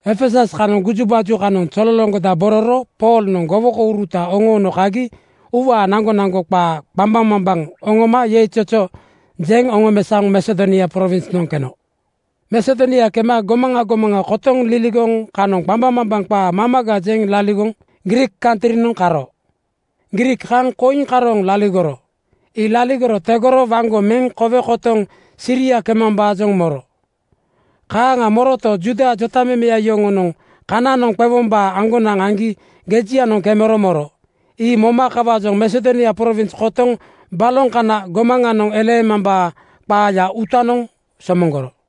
Efesus kanoŋ gujubaju kanoŋ zololoŋgodabororo Poolnoŋ gowokouruta oŋoono kagi uuwaa naŋgonaŋgo qaa qambaŋmambaŋ oŋoma yeizozo jeŋ oŋomesaoŋ Masedonia prowinsnoŋ keno. Masedonia kema gomaŋa gomaŋa kotoŋ liligoŋ kanoŋ qambaŋmambaŋ qaa mamaga jeŋ laligoŋ Griik kantrinoŋ karo. Griik kaŋ koiŋ karooŋ laligoro. Ii laligoro tegoro waŋgo meŋ kowe kotoŋ Siria kemambaajoŋ moro. Kaaŋa moroto, Juuda jotamemeya yoŋonoŋ kananoŋ qewombaa aŋgonaŋ aŋgi gejianoŋ kemero moro. Ii moma kawaajoŋ Masedonia prowins kotoŋ baloŋ kana gomaŋanoŋ eleemambaa qaaya uutanoŋ somoŋgoro.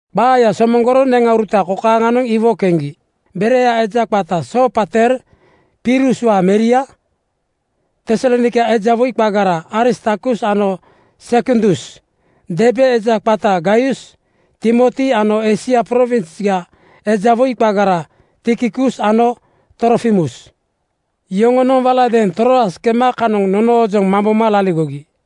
Qaaya somoŋgoro neŋauruta kokaaŋanoŋ iwo keŋgi: Berea eja qata Soopater Piruswaa meria, Tesalonaika eja woi qagara Aristarkus ano Sekundus, Derbe eja qata Gaius, Timoti ano Eisia prowinsga eja woi qagara Tikikus ano Trofimus. Yoŋonoŋ waladeeŋ Troas kema kanoŋ nonoojoŋ mamboma laligogi.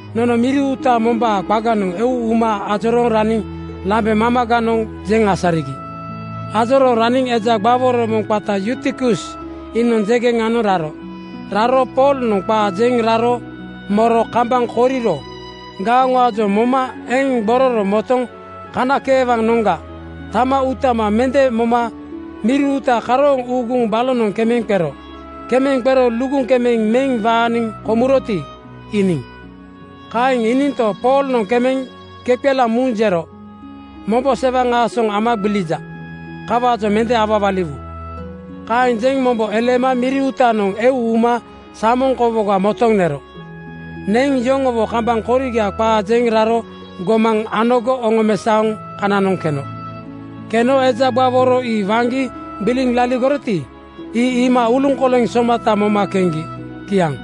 Nono miri uuta mombaa qaganoŋ eu uma ajorooŋ raniŋ lambe mamaganoŋ jeŋ asarigi. Ajorooŋ raniŋ eja gbaworo moŋ qata Yutikus iinoŋ jeŋgenanoŋ raro. Raro Poolnoŋ qaa jeŋ raro moro kambaŋ koriro gaoŋaajoŋ moma eŋ gbororo motoŋ kanakeewanoŋga tama uuta mende moma miri uuta karooŋ uuguŋ balonoŋ kemeŋ qero. Kemeŋ qero luguŋ kemeŋ meŋ waaniŋ komuroti, iiniŋ. Kaeŋ iininto, Poolnoŋ kemeŋ kepelaaŋ muŋ jero, “Mombo sewaŋ aasoŋ ama gbilija. Kawaajoŋ mende awawaliwu.” Kaeŋ jeŋ mombo eleema miri uutanoŋ eu uma samoŋ kowoga motoŋ nero. Neŋ yoŋowo kambaŋ koriga qaa jeŋ raro gomaŋ anogo oŋomesaoŋ kananoŋ keno. Keno eja gbaworo ii waŋgi gbiliŋ laligoroti, ii iima uluŋkoleŋ somata moma keŋgi. Kiaŋ.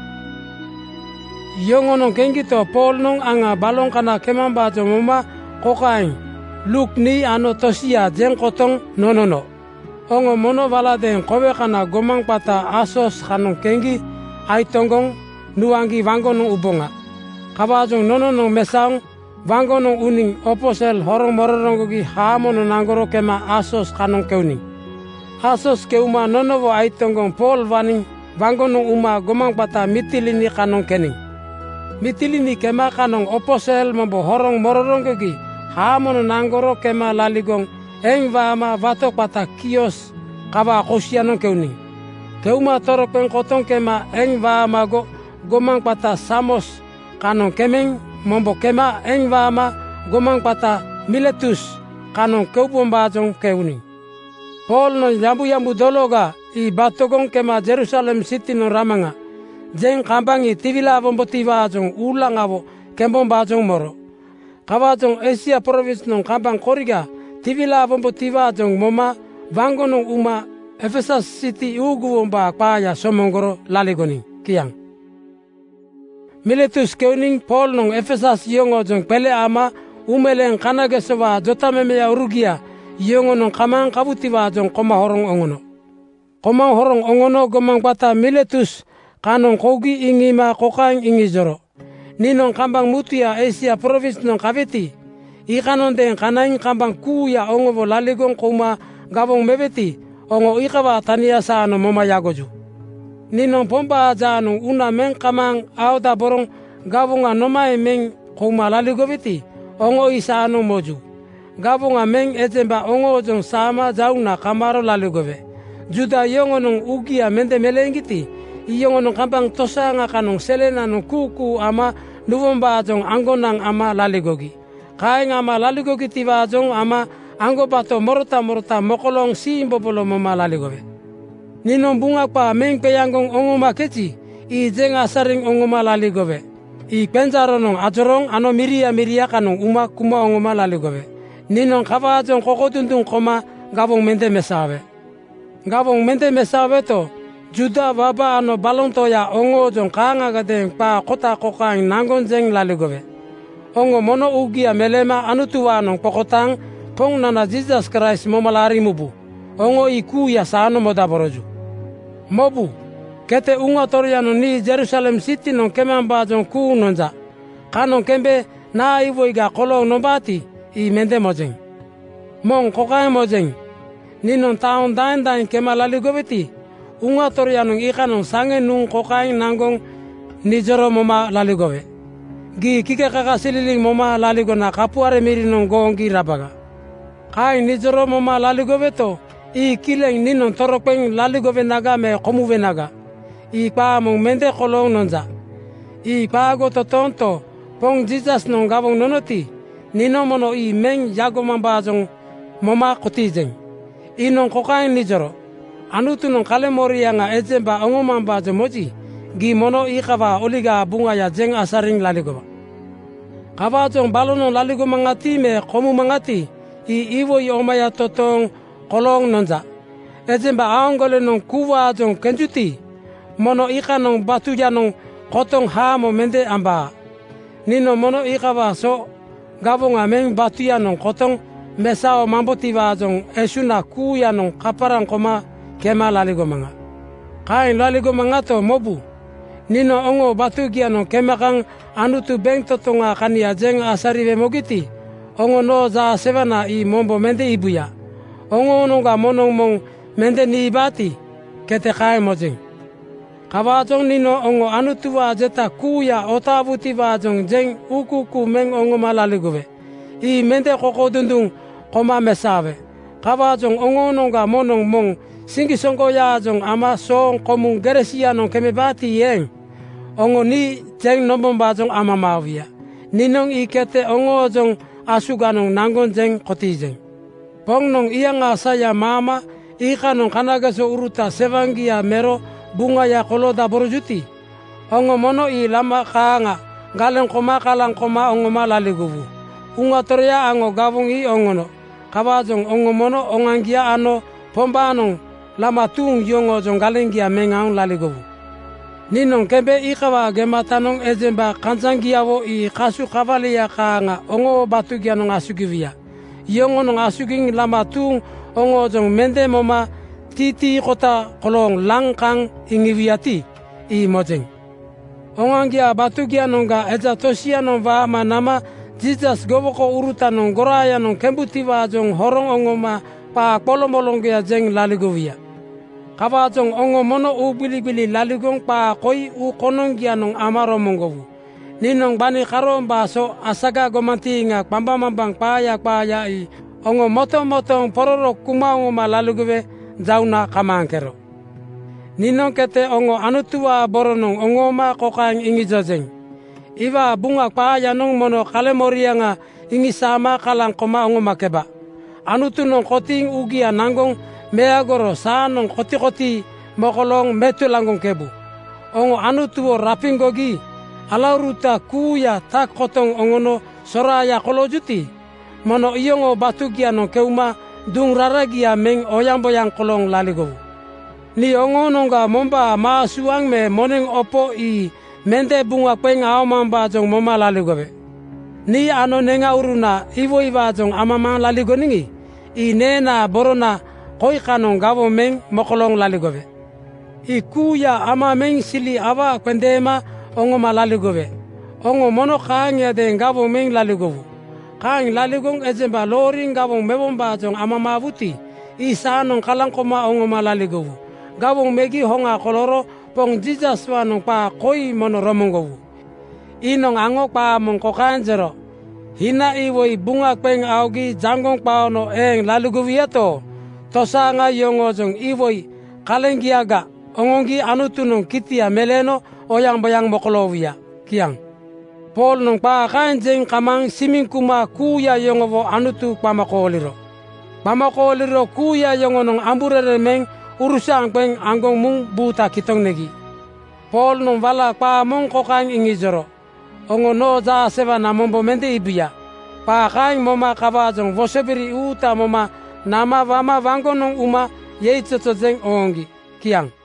Yoŋonoŋ keŋgito, Poolnoŋ aŋa baloŋ kana kemambaajoŋ moma kokaeŋ Luuk nii ano tosia jeŋ kotoŋ nonono, “Oŋo mono waladeeŋ kowe kana gomaŋ qata Asos kanoŋ keŋgi aitoŋgoŋ nuaŋgi waŋgonoŋ uboŋa.” Kawaajoŋ nononoŋ mesaoŋ waŋgonoŋ uniŋ opo sel horoŋ mororoŋgogi haamonoŋ naŋgoro kema Asos kanoŋ keuniŋ. Asos keuma nonowo aitoŋgoŋ Pool waniŋ waŋgonoŋ uma gomaŋ qata Mitilini kanoŋ keniŋ. Mitilini kema kanoŋ opo sel mombo horoŋ mororoŋgogi haamonoŋ naŋgoro kema laligoŋ eŋ waama wato qata Kios kawaa kosianoŋ keuniŋ. Keuma toroqeŋ kotoŋ kema eŋ waamago gomaŋ qata Samos kanoŋ kemeŋ mombo kema eŋ waama gomaŋ qata Miletus kanoŋ kokaembaajoŋ keuniŋ: Poolnoŋ “Yambuyambu dologa (Pentekost) ii batogoŋ kema Jerusalem sitinoŋ ramaŋa,” jeŋ kambaŋ tiwilaawombotiwaajoŋ uulaŋawo kembombaajoŋ moro. Kawaajoŋ Eisia prowinsnoŋ kambaŋ koriga tiwilaawombotiwaajoŋ moma waŋgonoŋ uma Efesus siti uuguwombaa qaaya somoŋgoro laligoniŋ. Kiaŋ. Miletus keuniŋ Poolnoŋ Efesus yoŋoojoŋ qele ama uumeleeŋ kanagesowaa jotamemeurugia yoŋonoŋ kamaaŋ kawutiwaajoŋ koma horoŋ oŋono. Koma horoŋ oŋono gomaŋ qata Miletus kanoŋ kougi iŋiima kokaeŋ iŋijoro, “Niinoŋ kambaŋ mutuya Eisia prowinsnoŋ kaweti, iikanoŋadeeŋ kanaiŋ kambaŋ kuuya oŋowo laligoŋ kouma gawoŋ meweti, oŋo iikawaa tania saanoŋ moma yagoju. Niinoŋ Pombaa jaanoŋ uuna meŋ kamaaŋ aodaboroŋ gawoŋa nomaeŋ meŋ kouma laligoweti, oŋo ii saanoŋ moju. Gawoŋa meŋ ejemba oŋoojoŋ saama jauŋna kamaaro laligowe. Juuda yoŋonoŋ uugia mende meleeŋgiti, iyoŋonoŋ kambaŋ tosaaŋa kanoŋ selenoŋ kuukuu ama nuwombaajoŋ aŋgonaŋ ama laligogi. Kaeŋ ama laligogitiwaajoŋ ama aŋgobato morota morota mokolooŋ siimbobolo moma laligowe. “Niinoŋ Buŋa qaa meŋ qeaŋgoŋ oŋomakeji, ii jeŋ asariŋ oŋoma laligowe. Ii qenjaaronoŋ ajorooŋ ano miria miria kanoŋ uma kuma oŋoma laligowe. Niinoŋ kawaajoŋ kokodunduŋ koma gawoŋ mende mesaowe. Gawoŋ mende mesaoweto, Juuda waba ano baloŋ toya oŋoojoŋ kaaŋagadeeŋ qaa kota kokaeŋ naŋgoŋ jeŋ laligowe, ‘Oŋo mono uugia meleema Anutuwaanoŋ qokotaaŋ Poŋnana Jiisas Kraist moma laariŋ mubu.’ Oŋo ii kuuya saanoŋ modaboroju. “Mobu, kete Uŋa Toroyanoŋ nii Jerusalem sitinoŋ kemambaajoŋ kuuŋ nonja. Kanoŋ kembe naa iwoiga kolooŋ nombaati, ii mende mojeŋ. Moŋ kokaeŋ mojeŋ: Niinoŋ taoŋ daeŋ daeŋ kema laligoweti, Uŋa Toroyanoŋ iikanoŋ saŋe nuŋ kokaeŋ naŋgoŋ nijoro moma laligowe, ‘Gii kakasililiŋ moma laligona kapuare mirinoŋ gooŋgi rabaga.’ Kaeŋ nijoro moma laligoweto, ii kileŋ. Niinoŋ toroqeŋ laligowenaga me komuwenaga, ii qaa moŋ mende kolooŋ nonja. Ii qaago totoonto, Poŋ Jiisasnoŋ gawoŋ nonoti, niinoŋ mono ii meŋ yagomambaajoŋ moma kotiijeŋ. Iinoŋ kokaeŋ nijoro, ‘Anutunoŋ kaleŋmoriaŋa ejemba oŋomambaajoŋ moji, gii mono iikawaa Oligaa Buŋaya jeŋ asariŋ laligowa.’ Kawaajoŋ balonoŋ laligomaŋati me komumaŋati, ii iwoi omaya totooŋ kolooŋ nonja. Ejemba aaŋgolenoŋ kuuwaajoŋ kenjuti, moŋnoŋ iikanoŋ batuyanoŋ kotoŋ haamo mende ambaa. Niinoŋ mono iikawaa so gawoŋa meŋ batuyanoŋ kotoŋ mesaomambotiwaajoŋ esuŋna kuuyanoŋ kaparaŋ koma kema laligomaŋa. “Kaeŋ laligomaŋato, mobu, niinoŋ oŋoo batugianoŋ kema kaŋ Anutu bentotoŋaa kania jeŋ asariwe mogiti, oŋo noo jaasewana ii mombo mende iibuya. Oŋoonoŋga moŋnoŋ moŋ mende niibaati, kete kaeŋ mojeŋ. Kawaajoŋ niinoŋ oŋo Anutuwaa jeta kuuya otaawutiwaajoŋ jeŋ uukuukuu meŋ oŋoma laligowe. Ii mende kokodunduŋ koma mesaowe. Kawaajoŋ oŋoonoŋga moŋnoŋ moŋ siŋgisoŋgoyaajoŋ ama sooŋ komuŋ gere sianoŋ kemebaati eeŋ, oŋo nii jeŋ nombombaajoŋ amamaawuya. Niinoŋ ii kete oŋoojoŋ asuganoŋ naŋgoŋ jeŋ kotiijeŋ. “Poŋnoŋ iyaŋaa saya maama iikanoŋ kanagesouruta sewaŋgia mero buŋaya koloodaborojuti, oŋo mono ii lama kaaŋa galeŋ koma kalaŋ koma oŋoma laligowu. Uŋa Toroya aŋo gawoŋ ii oŋono. Kawaajoŋ oŋo mono oŋoaŋgia ano Pombaanoŋ lama tuuŋ yoŋoojoŋ galeŋgia meŋ aoŋ laligowu. Niinoŋ kembe iikawaa gematanoŋ ejemba kanjaŋgiawo ii kasu kawalia kaaŋa oŋoo batugianoŋ asugiwuya. Yoŋonoŋ asugiŋ lama tuuŋ oŋoojoŋ mende moma titiikota kolooŋ laŋ kaŋ iŋiwuyati, ii mojeŋ. Oŋoaŋgiaa batugianoŋga eja tosianoŋ waama nama Jiisas gowokourutanoŋ goraayanoŋ kembutiwaajoŋ horoŋ oŋoma qaa qoloŋmoloŋgoya jeŋ laligowuya. Kawaajoŋ oŋo mono uugbiligbili laligoŋ qaa koi uu konoŋgianoŋ ama romoŋgowu: Niinoŋ gbani karoombaa so asaga gomantiiŋa qambaŋmambaŋ qaaya qaaya ii oŋo motomotooŋ pororo kuma oŋoma laligowe jauŋna kamaaŋkero. “Niinoŋ kete oŋo Anutuwaa boronoŋ oŋooma kokaeŋ iŋijojeŋ: Iwaa Buŋa qaayanoŋ mono kaleŋmoriaŋa iŋisaama kalaŋ koma oŋomakeba. Anutunoŋ kotiiŋ uugia naŋgoŋ meagoro saanoŋ kotikotii mokolooŋ metulaŋgoŋkebu. Oŋo Anutuwo rapiŋgogi alauruta kuuya tak kotoŋ oŋono soraaya koloojuti, mono iyoŋoo batugianoŋ keuma duŋ raragia meŋ oyaŋboyaŋ kolooŋ laligowu. Nii oŋoonoŋga mombaa maa suaŋ me moneŋ opo ii mende buŋa qeŋ aomambaajoŋ moma laligowe. Nii ano neŋauruna iwoiwaajoŋ amamaaŋ laligoniŋi, ii neenaa borona koi kanoŋ gawoŋ meŋ mokolooŋ laligowe. “Ii kuuya ama meŋ sili awaa qendeema oŋoma laligowe. Oŋo mono kaaŋiadeeŋ gawoŋ meŋ laligowu. Kaeŋ laligoŋ ejemba looriŋ gawoŋ mewombaajoŋ amamaawuti, ii saanoŋ kalaŋ koma oŋoma laligowu. Gawoŋ megi hoŋa kolooro Poŋ Jiisaswaanoŋ qaa koi mono romoŋgowu: Iinoŋ aŋo qaa moŋ kokaeŋ jero, ‘Hina iwoi buŋa qeŋ aogi jaŋgoŋ qaono eeŋ laligowuyato, tosaaŋa yoŋoojoŋ iwoi kaleŋgiaga oŋoŋgi Anutunoŋ kitia meleeno oyaŋboyaŋ mokoloowuya.’ Kiaŋ.” Poolnoŋ qaa kaeŋ jeŋ kamaaŋ simiŋ kuma kuuya yoŋowo Anutu qama kooliro. Qama kooliro kuuya yoŋonoŋ amburereŋ meŋ urusaaŋ qeŋ aŋgoŋ muŋ buuta kitoŋ negi. Poolnoŋ wala qaa moŋ kokaeŋ iŋijoro, “Oŋo noo jaasewana mombo mende iibuya.” Qaa kaeŋ moma kawaajoŋ wosobiri uuta moma nama wama waŋgonoŋ uma yeizozo jeŋ ooŋgi. Kiaŋ.